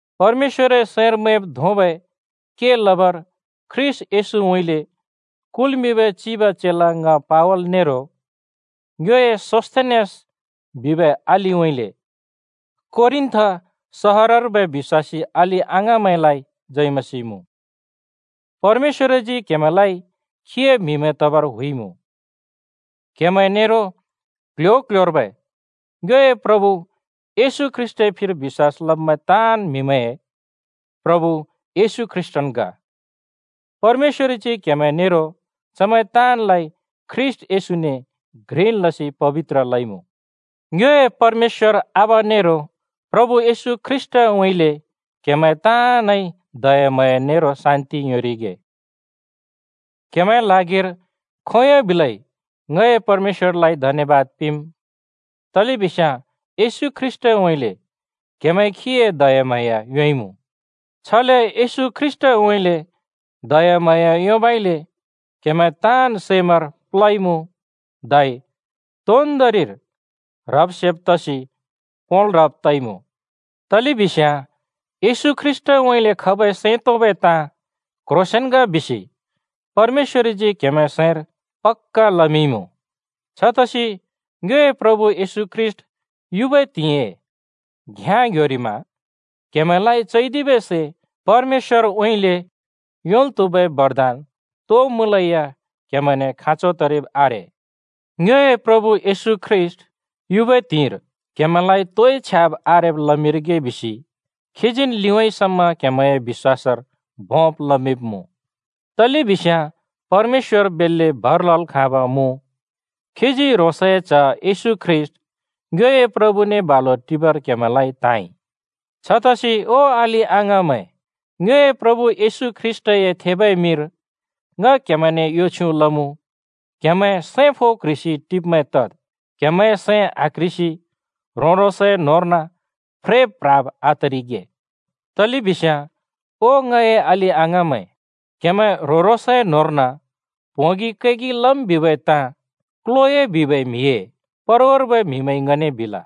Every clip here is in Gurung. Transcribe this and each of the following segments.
परमेश्‍वरए सैंर मैंब् धोंबै के लबर ख्रीष्‍ट येशूउँइँले कुल्मिंबै चिब चेला ङ पावल नेरो ङ्योए सोस्थेनेस बिबै अलिउँइँले कोरिन्थ सहरर्बै बिश्‍वासी अलि-अङाँमैंलाइ जय मसीह मुँ। परमेश्‍वरजी क्हेमैंलाइ खीए म्हिमैं तबर हुइमुँ। क्हेमैं नेरो क्ल्ह्‍यो-क्ल्ह्‍योर्बै ङ्योए प्रभु येशू ख्रीष्‍टए फिर बिश्‍वास लबै ताँन् म्हिमैंए प्रभु येशू ख्रीष्‍टन् ग। परमेश्‍वरजी क्हेमैं नेरो चमैं ताँनलाइ ख्रीष्‍ट येशूने घ्रिन् लसि पबित्र लइमुँ। ङ्योए परमेश्‍वर आबा नेरो प्रभु येशू ख्रीष्‍टउँइँले क्‍हेमैं ताँनइ दयाम्हाँया नेरो शान्‍ति योंरिगे। क्‍हेमैंए ल्हागिर खोंयोंन् बिलै ङए परमेश्‍वरलाइ धन्‍यबाद पिंम्, तलेबिस्याँ येशू ख्रीष्‍टउँइँले क्‍हेमैंइ खीए दयाम्हाँया योंइमुँ। छले येशू ख्रीष्‍टउँइँले दयाम्हाँया योंबइले क्हेमैं ताँन् सैमैंर प्ल्होइमुँ धै तोन्दोंरिर ह्रब् सेब् तसि पोंल् ह्रब् तइमुँ। तलेबिस्याँ येशू ख्रीष्‍टउँइँले खबै सैं तोंबै ताँ क्ह्रोंसेंन् ग बिसि परमेश्‍वरजी क्‍हेमैंए सैंर पक्‍का लमिंइमुँ। छतसि ङ्योए प्रभु येशू ख्रीष्‍ट युबै त्हिंइए घ्‍याँ ङ्ह्‍योरिमा क्‍हेमैंलाइ चैदिबै परमेश्‍वरउँइँले योंल् त्हुबै बरदान तो मुँलेया क्हेमैंने खाँचो तरिब् आरे। ङ्योए प्रभु येशू ख्रीष्‍ट युबै त्हिंइर क्‍हेमैंलाइ तोइ छ्याब् आरेब लमिंरिगे बिसि खीजीन् लिउँइँ समा क्हेमैंए बिश्‍वासर भोंब लमिंब्मुँ। तलेबिस्याँ परमेश्‍वर बेल्‍ले भर लल् खाँब मुँ, खीजी ह्रोंसए च्‍ह येशू ख्रीष्‍ट ङ्योए प्रभुने बालु टिबर क्‍हेमैंलाइ त्‍हाँइ। छतसि ओ अलि-अङाँमैं, ङ्योए प्रभु येशू ख्रीष्‍टए थेबै मिंर ङ क्हेमैंने यो छ्युँ लमुँ: क्‍हेमैं सैं फो क्ह्रिसि टिब्मैं तद्, क्हेमैंए सैं आक्ह्रिसि ह्रों-ह्रोंसए न्होंर्न फ्रेब् प्ह्राब् आतरिगे। तलेबिस्याँ ओ ङए अलि अङाँमैं, क्‍हेमैं ह्रों-ह्रोंसए न्‍होंर्न प्होंगि कैगि लम् बिबै ताँ क्‍लोए बिबै म्हिए परवार्बै म्‍हिमैंइ ङने बिल।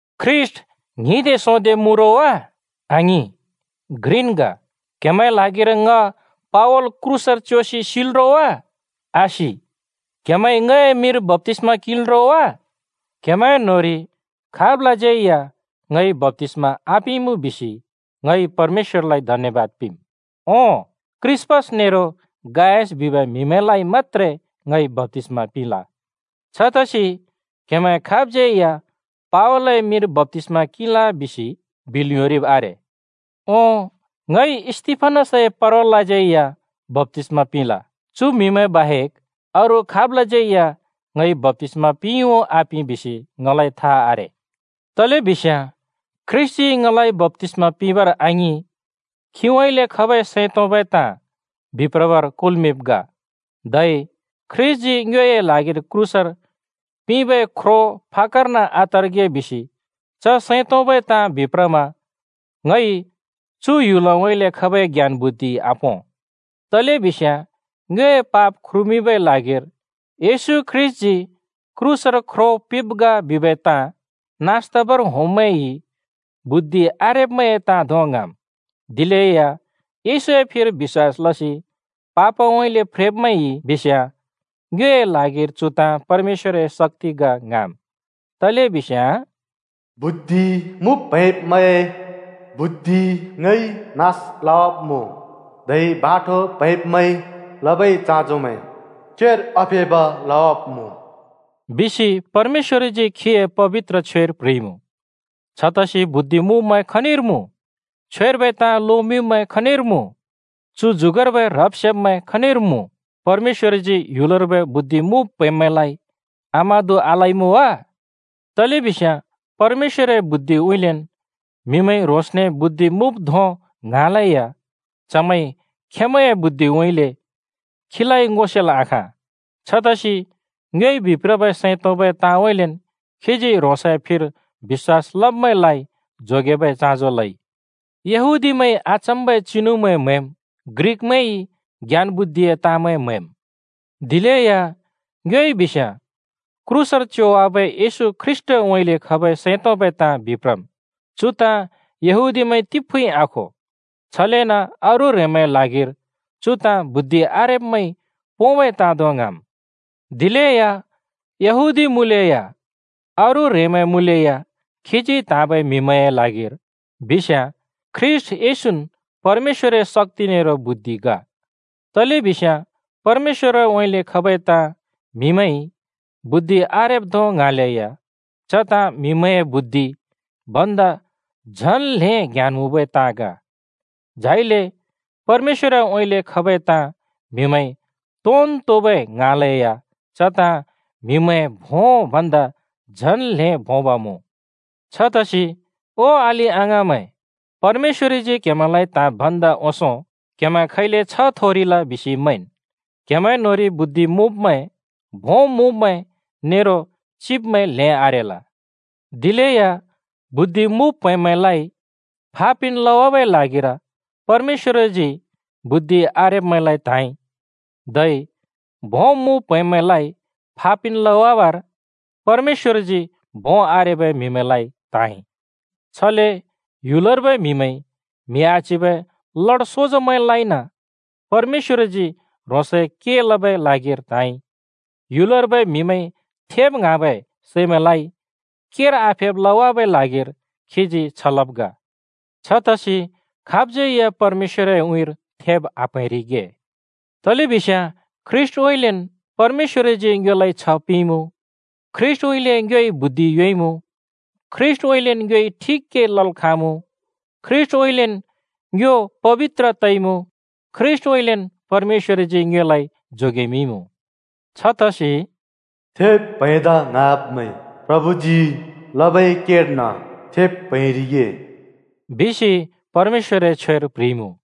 ख्रीष्‍ट ङ्हिंदे सोंदे मुँ रो वा? आङिं, घ्रिन् ग! क्‍हेमैंए ल्हागिर ङ पावल क्रूसर च्योसि सिल् रो वा? आसि! क्‍हेमैंइ ङए मिंर बप्‍तिस्‍मा किंल् रो वा? क्हेमैं न्होंरि खाबलाज्यै या ङइ बप्‍तिस्‍मा आपिंइमुँ बिसि ङइ परमेश्‍वरलाइ धन्‍यबाद पिंम्! ओं, क्रिस्‍पस नेरो गायस बिबै म्हिमैंलाइ मत्‍त्रे ङइ बप्‍तिस्‍मा पिंल। छतसि क्हेमैं खाबज्‍यै या “पावलए मिंर बप्‍तिस्‍मा किंल!” बिल् योंरिब् आरे। (ओं, ङइ स्‍तिफनसए परवालाज्यै या बप्‍तिस्‍मा पिंल। चु म्हिमैं बाहेक अरू खाबलाज्यै या ङइ बप्‍तिस्मा पिंइ उ आपिं बिसि ङलाइ था आरे।) तलेबिस्याँ ख्रीष्‍टजी ङलाइ बप्‍तिस्‍मा पिंबर आङिं, खीउँइँले खबै सैं तोंबै ताँ बिप्रबर कुल्‍मिंब् ग। धै ख्रीष्‍टजी ङ्योए ल्हागिर क्रूसर पिंबै ख्रो फाक्‍कर्न आतरिगे बिसि च सैं तोंबै ताँ बिप्रमा ङइ चु ह्‍युलउँइँले खबै ज्ञान-बुद्धिइ आपों। तलेबिस्याँ ङ्योए पाप ख्रुमिंबै ल्हागिर येशू ख्रीष्‍टजी क्रूसर ख्रो पिंब् ग बिबै ताँ नास तबर होंब्मैंइ बुद्धि आरेब्मैंए ताँ धों ङ्हाँम्, दिलेया येशूए फिर बिश्‍वास लसि पापउँइँले फ्रेब्मैंइ बिस्याँ ङ्योए ल्हागिर चु ताँ परमेश्‍वरए शक्‍ति ग ङ्हाँम्। तलेबिस्याँ “बुद्धि मुँब् प्हैंब्मैंए बुद्धि ङइ नास लवाब्मुँ, धै बाठो प्हैंब्मैंइ लबै चाँजोमैं केर आफेब् लवाब्मुँ,” बिसि परमेश्‍वरजी खीए पबित्र छ्वेर प्ह्रिइमुँ। छतसि बुद्धि मुँब्मैं खनिर मुँ? छ्वेर्बै ताँ लोमिंब्मैं खनिर मुँ? चु जुगर्बै ह्रब्-सेब्मैं खनिर मुँ? परमेश्‍वरजी ह्‍युलर्बै बुद्धि मुँब् प्हैंब्मैंलाइ आमादु आलइमुँ वा? तलेबिस्याँ परमेश्‍वरए बुद्धिउँइँलेन् म्‍हिमैंइ ह्रोंसने बुद्धि मुँब् धों ङ्हाँलेया चमैंइ खेंमैंए “बुद्धिउँइँले” खीलाइ ङो सेल् आखाँ। छतसि ङ्योइ बिप्रबै सैं तोंबै ताँउँइँलेन् खीजी ह्रोंसए फिर बिश्‍वास लब्‍मैंलाइ जोगेबै चाँजो लइ। यहूदीमैंइ अचम्मबै चिनुमैं म्‍हैम्, ग्रिकमैंइ ज्ञान-बुद्धिए ताँमैं म्‍हैम्। दिलेया ङ्योइ बिस्याँ क्रूसर च्योवाबै येशू ख्रीष्‍टउँइँले खबै सैं तोंबै ताँ बिप्रम्। चु ताँ यहूदीमैंइ तिफुँइ आखो, छलेन अरू ह्रेंमैंए ल्हागिर चु ताँ बुद्धि आरेब्मैंइ पोंबै ताँ धों ङ्हाँम्। दिलेया यहूदी मुँलेया, अरू ह्रेंमैं मुँलेया खीजी त्हाँबै म्हिमैंए ल्हागिर बिस्याँ ख्रीष्‍ट येशून् परमेश्‍वरए शक्‍ति नेरो बुद्धि ग। तलेबिस्याँ परमेश्‍वरउँइँले खबै ताँ म्‍हिमैंइ “बुद्धि आरेब्” धों ङ्हाँलेया च ताँ म्‍हिमैंए “बुद्धि” भन्दा झन् ल्हें ज्ञान मुँबै ताँ ग, झाइले परमेश्‍वरउँइँले खबै ताँ म्‍हिमैंइ “तोन् तोबै” ङ्हाँलेया च ताँ म्‍हिमैंए भों भन्दा झन् ल्हें भोंब मुँ। छतसि ओ अलि-अङाँमैं, परमेश्‍वरजी क्हेमैंलाइ त्‍हाँब् भन्दा ओंसों क्हेमैं खैले छ्ह थोरिल बिसि मैंन्। क्‍हेमैं न्‍होंरि बुद्धि मुँब्मैं, भों मुँब्मैं नेरो चिब्मैं ल्हें आरेल। दिलेया बुद्धि मुँब् प्हैंब्मैंलाइ फा पिन् लवाबै ल्हागिर परमेश्‍वरजी बुद्धि आरेब्मैंलाइ त्‍हाँइ, धै भों मुँब् प्हैंब्‍मैंलाइ फा पिन् लबर परमेश्‍वरजी भों आरेबै म्हिमैंलाइ त्हाँइ। छले ह्‍युलर्बै म्हिमैंइ म्हि आच्हिबै म्हिमैंलाइन परमेश्‍वरजी ह्रोंसए के लबै ल्हागिर त्हाँइ। ह्‍युलर्बै म्हिमैंइ थेब ङ्हाँबै सैमैंलाइ केर आफेब् लवाबै ल्हागिर खीजी छ लब् ग। छतसि खाबज्यै या परमेश्‍वरए उँइँर थेब आप्‍हैंरिगे। तलेबिस्याँ ख्रीष्‍टउँइँलेन् परमेश्‍वरजी ङ्योलाइ छ्ह पिंइमुँ, ख्रीष्‍टउँइँले ङ्योइ बुद्धि योंइमुँ, ख्रीष्‍टउँइँलेन् ङ्योइ ठिक के लल् खाँमुँ, ख्रीष्‍टउँइँलेन् ङ्यो पबित्र तइमुँ, ख्रीष्‍टउँइँलेन् परमेश्‍वरजी ङ्योलाइ जोगेमिंइमुँ। छतसि “थेब् प्‍हैंदा ङ्हाँब्मैं प्रभुजी लबै केर्न थेब् प्‍हैंरिगे,” बिसि परमेश्‍वरए छ्वेर प्ह्रिइमुँ।